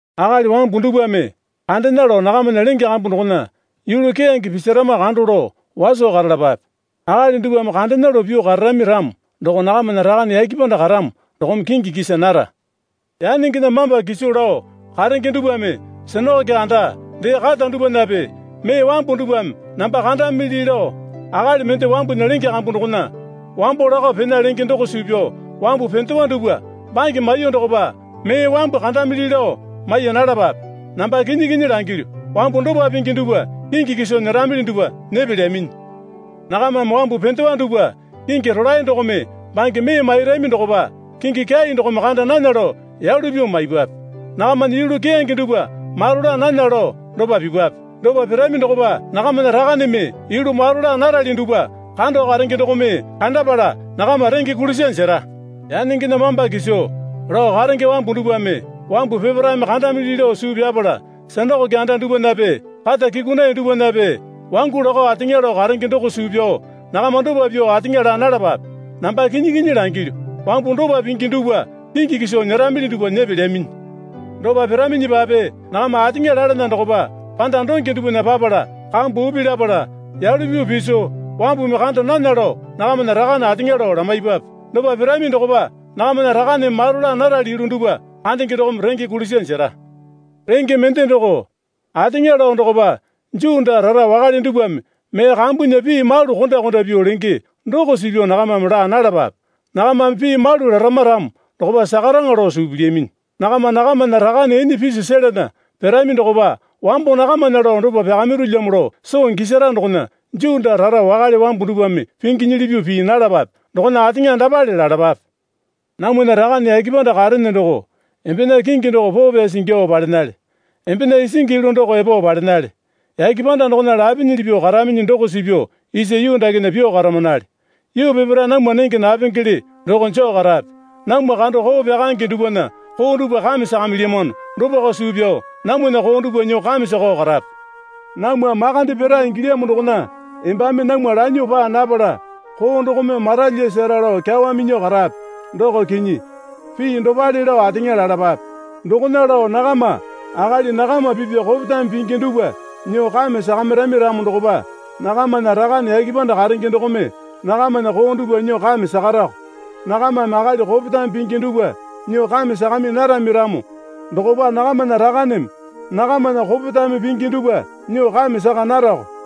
Akali wambu dupwame kandena lao nakamana lenge kambu dokona yulu keyange pisarama kando lao waso karalapape. Akali dupwame kandena lao pyuo kararami ramo doko nakamana Rakane yake panda karamo dokome kingi kisa nara. Yanengena mamba kiso lao karenge dupwame sinakoke anda dee kata dupwanape mee wambu dupwame namba kandamili lao akali mende wambunya lenge kambu dokona wambo lakao pena lenge doko suu pyao wambu pendewa dupwa bange maiyuo dokopa mee wambu kandamili lao maiya nalapape. Namba kinyi kinyi langilyu, wambu dopa pingi dupwa kingi kiso nyeramili dupwa nyepelyaminyi. Nakamame wambu pendewa dupwa kingi rolae dokome bange mee mairami dokopa kingi kyai dokome kanda nana lao yalu pyuo maipwape. Nakamana yulu keyange dupwa maro laa nana lao dopa pipwape. Dopa pirami dokopa nakamana Rakaneme yulu maro laa narali dupwa kando karenge dokome kandapala nakama renge kulisa jera. Yanengena mamba kiso lao karenge wambu dupwame wambu peparaeme kandamili lao suu pyapala sinakoke anda dupwanape kata kyukunaiya dupwanape wangu lakao ateŋa lao karenge doko suu pyao nakama dopa pyuo ateŋa laa nalapape. Namba kinyi kinyi langilyu, wambu dopa pingi dupwa kingi kiso nyeramili dupwa nyepelyaminyi. Dopa piraminyipape nakama ateŋa lalana dokopa panda donge dupwana papala kambu upi lapala yalu pyuo piso wambumi kanda nana lao nakamana Rakane ateŋa lao lamaipwape. Dopa pirami dokopa nakamana Rakaneme maro laa narali yulu dupwa kandenge dokome renge kulisa jera. Renge mende doko, ateŋa lao dokopa Juu daa rara wakale dupwame mee kambunya pii malu konda konda pyuo lenge doko suu pyao nakamame laa nalapape. Nakamame pii malu larama ramo dokopa sakaraŋa lao suu pilyaminyi. Nakama nakamana Rakane ene piso selana pirami dokopa wambo nakamana lao dopa pyakamirulyamo lao soo gisara dokona Juu daa rara wakale wambu dupwame pinginyili pyuo pii nalapape. Dokona ateŋa dapale lalapape. Namwana Rakane yake panda karene doko, embena kingi doko poo pyasi ingyuo palenale. Embena isingi yulu doko epo palenale. Yake panda dokona lapinyili pyuo karaminyi doko suu pyao isa yuu dakena pyuo karamanale. Yuu peparae namwa nenge napengele doko joo karape. Namwa kando koo pyakaenge dupwana koo dupwa kame sakamilyamano dopako suu pyao namwana koo dupwa nyuo kame sakao karape. Namwa makande pira ingilyamo dokona embame namwa lanyuo paa napala koo dokome maralyasara lao kyawa minyuo karape. Pii dopale lao ateŋa lalapape. Dokona lao nakama akali nakama pipya kopetame pingi dupwa nyuo kame sakamirami ramo dokopa nakamana Rakane yake panda karenge dokome nakamana koo dupwa nyuo kame sakarako. Nakamame akali kopetame pingi dupwa nyuo kame sakami narami ramo dokopa nakamana Rakaneme nakamana kopetame pingi dupwa nyuo kame saka narako.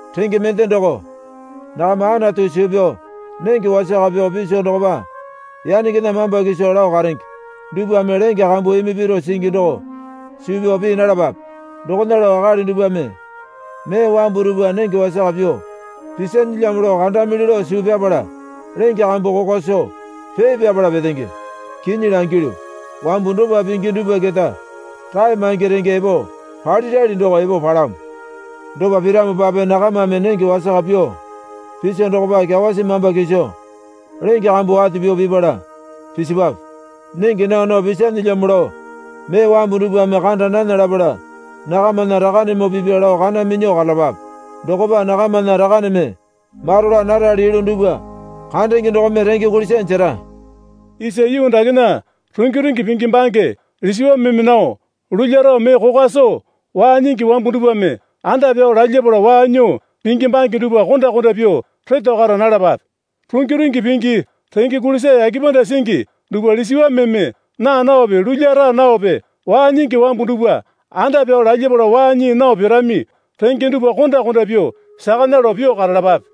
Renge mende doko, nakama Anatu suu pyao nenge wasaka pyuo piso dokopa yanengena mamba kiso lao karenge dupwame lenge kambu imi piro singi doko suu pyao pii nalapape. Dokona lao akali dupwame mee wambu dupwa nenge wasaka pyuo pisanelyamo lao kandamili lao suu pyapala lenge kambu kokwa soo pee pyapala petenge. Kinyi langilyu, wambu dopa pingi dupwa keta rae maingi renge epo palirali doko epo palamo. Dopa piramopape nakamame nenge wasaka pyuo piso dokopa kyawasi mamba kiso lenge kambu wate pyuo pipala pisipwape. Nenge naa nao pisanelyamo lao mee wambu dupwame kanda nana lapala nakamana Rakanemoo pipya lao kana minyuo karalapape. Dokopa nakamana Rakaneme maro laa narali yulu dupwa kandenge dokome renge kulisa jera. Isa yuu dakena rungi rungi pingi bange lisiwameme nao lulya rao mee kokwa soo, waa nyingi wambu dupwame anda pyao lalyapala waa nyuo pingi bange dupwa konda konda pyuo reto kara nalapape. Rungi rungi pingi renge kulisa yake panda singi dupwa lisiwameme naa naope lulya raa naope waa nyingi wambu dupwa anda pyao lalyapala waa nyii nao pirami renge dupwa konda konda pyuo sakana lao pyuo karalapape.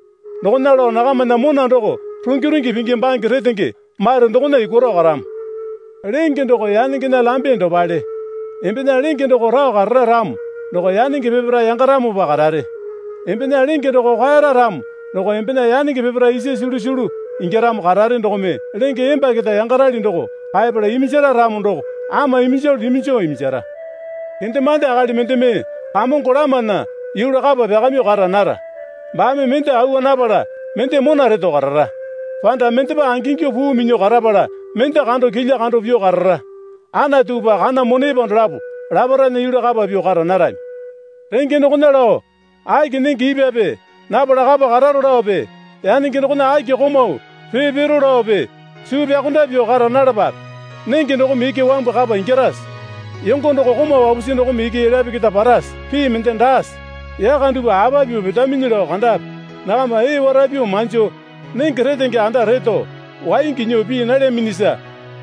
Dokona lao nakamana mona doko rungi rungi pingi bange retenge mate dokona yukwaro karamo. Lenge doko yanengena lambe dopale. Embena lenge doko rao karara ramo doko yanenge peparae yangaramopa karare. Embena lenge doko kwaera ramo doko embena yanenge peparae isa sulusulu ingyaramo karare dokome lenge emba keta yangarali doko kaepala iminjara ramo doko ama iminjalu iminjo iminjara. Kendemande akali mendeme kamongo lamana yulu kapa pyakamyuo kara nara. Baame mende awa napala mende mona reto karara. Panda mendepa angingyuo puu minyuo karapala mende kando kilya kando pyuo karara. Anatupa kana monepa dolapo laparaena yulu kapa pyuo kara narami. Renge dokona lao, Aki nenge ipwape napala kapa kararo laope yanenge dokona aki komau pee piro laope suu pyakonda pyuo kara nalapape. Nenge dokome iki wambu kapa ingyarase? Yongo doko komau wapusi dokome iki elyape keta parase? Pii mende daase? Yaka dupwa apa pyuo petaminyi lao kandape. Nakama ee wara pyuo manjo nenge retenge anda retao, waingi nyuo pii nalyaminyisa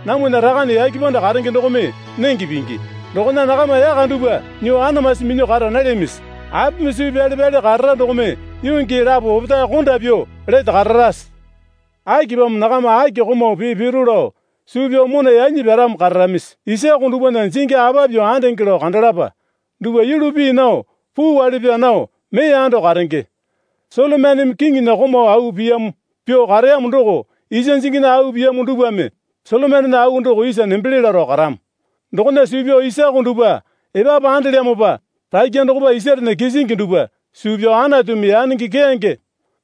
namwana Rakane yake panda karenge dokome nenge pingi. Dokona nakama yaka dupwa nyuo anamasi minyuo kara nalyamisi? Apimi suu pyale pyale karara dokome yuu gii lapo opetae konda pyuo lete kararase? Akipamo nakama aki komau pee piro lao suu pyao mona yanyi pyaramo kararamisi? Isako dupwana jingi apa pyuo andenge lao kandalapa. Dupwa yulu pii nao puu wale pyaa nao mee ando karenge. Solomoneme kiŋinya komau au piyamo pyuo kareyamo doko isa jinginya au piyamo dupwame Solomonena au doko isa nembele laro karamo. Dokona suu pyao isako dupwa epapu andelyamopa rakya dokopa isarena kisingi dupwa suu pyao Anatumi yanenge keyange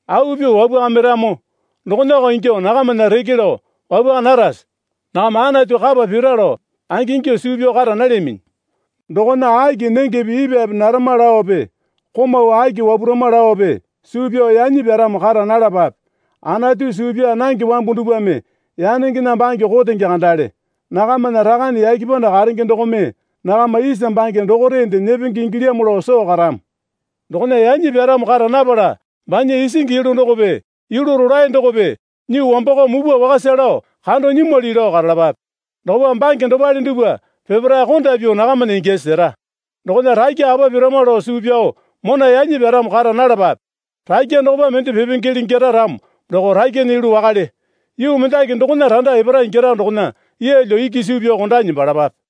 au pyuo wapwakamiramo dokonako ingyuo nakamana reke lao wapwaka narase? Nakama Anatu kapa pira lao angingyuo suu pyao kara nalyaminyi. Dokona aki nengepe ipwape narama laope komau aki wapurama laope suu pyao yanyi pyaramo kara nalapape. Anatu suu pyaa nange wambu dupwame yanengena bange kotenge kandale. Nakamana Rakane yake panda karenge dokome nakama isa bange dokorende nyepenge ingilyamo lao soo karamo. Dokona yanyi pyaramo kara napala banya isingi yulu dokope yulu rolae dokope nyuo wambakao mupwa wakasa lao kando nyimwali lao karalapape. Dokopa bange dopale dupwa peparae konda pyuo nakamana ingyasi sera. Dokona rakya apa pirama lao suu pyao mona yanyi pyaramo kara nalapape. Rakya dokopa mende pipengele ingyara ramo doko rakyana yulu wakale. Yuu mendaki dokona randa epara ingyara dokona yeelyo iki suu pyao kondanyi nembalapape.